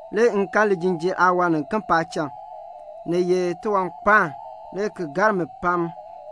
Le m kan lijinjiir aawan niken paacham. Ni ye tiwankpaan, le ki gar mi pam.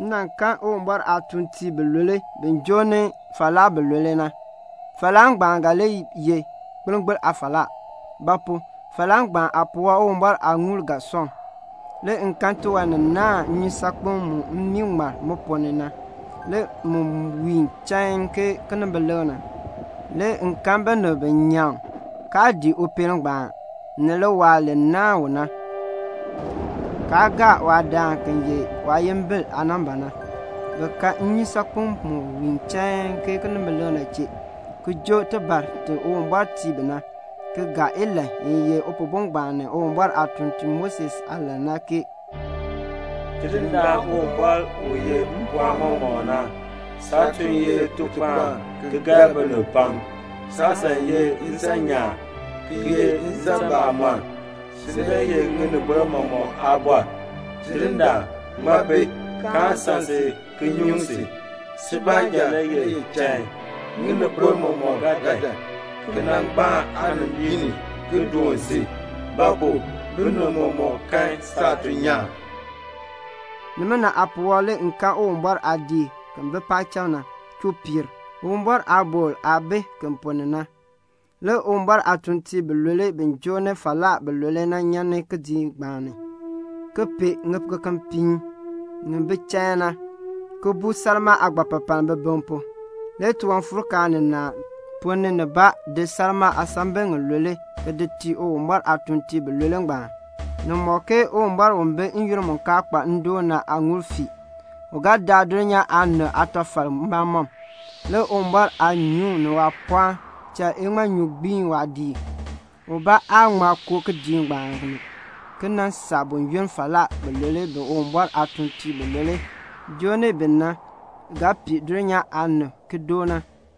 M kan Uwumbɔr aatuuntiib bilule bi joo ni falaa bilule na. Falaa ngbaan ga li ye gbilngbiln aafalaa; ba pu? falaa ngbaan aapuwɔb Uwumbɔr aaŋuul ga sɔŋ. Le m kan tiwan ni naahn nnyusaakpem mu mmii ŋmar mu ponn ni na, le mu wiin chain ke kinimbilik na. Le m kan binib bi nyaŋ, kaa dii upeel ngbaan, ni liwaal li naahn u na, kaa gaa waadaan ki ye waayimbil aanamba na; bi ka nnyusaakpem mu wiin chain ke kinimbilik na chee, ki joo tibar ti Uwumbɔr tii bi na, ki gaa ilahn i ye Upihbo ngbaan ni Uwumbɔr aatutuln Moses aalahn na ke "Tidindaan Uwumbɔr u yeh mpɔɔn mɔmɔk na, saatuln ye litukpaan ki gar binib pam. Saasan ye nsan nyaan, ki ye nsan bamɔnn. Si le ye ŋinibol mɔmɔk aabɔr. Tidindaan, ŋmaa bi, kaan san si ki nyuŋ si? Si baanja le ye chain. Ŋinibol mɔmɔk ga dan ki nan gbaan aanimbiin ni ki doon si; ba pu? binib mɔmɔk kan saatuln nyaan." Nimina aapuwɔb le m kan Uwumbɔr aadiik ki bi paacham na chuu piir a, Uwumbɔr aabɔkl aah bi ki ponn ni na. Le Uwumbɔr aatuuntiib bilule bi joo ni falaa bilule na nyan kidiik ngbaan ni, ki pee ŋikekepiin ŋi bi chain na, ki buu salmaa aagbapapaln bibiŋ pu. Le tiwanfuurkaan ninaa ponn ni nibaa di salmaa aasambil ŋilule ki di tii Uwumbɔr aatuuntiib bilule ngbaan. Ni mɔk ke Uwumbɔr u bi n-yoonn mu kaa kpa ndoon na aaŋuul fii. U ga daa dulnyaa aanib aatafal mbamɔm. Le Uwumbɔr aanyuŋ ni waapɔɔn cha iŋmanyu gbii waadiik. Ubaa aa ŋma koo kidiik ngbaan ni ki nan saa buyoonn falaa bilule u Uwumbɔr aatuuntiib bilule joo ni u na ga pii dulnyaa aanib ki doo na.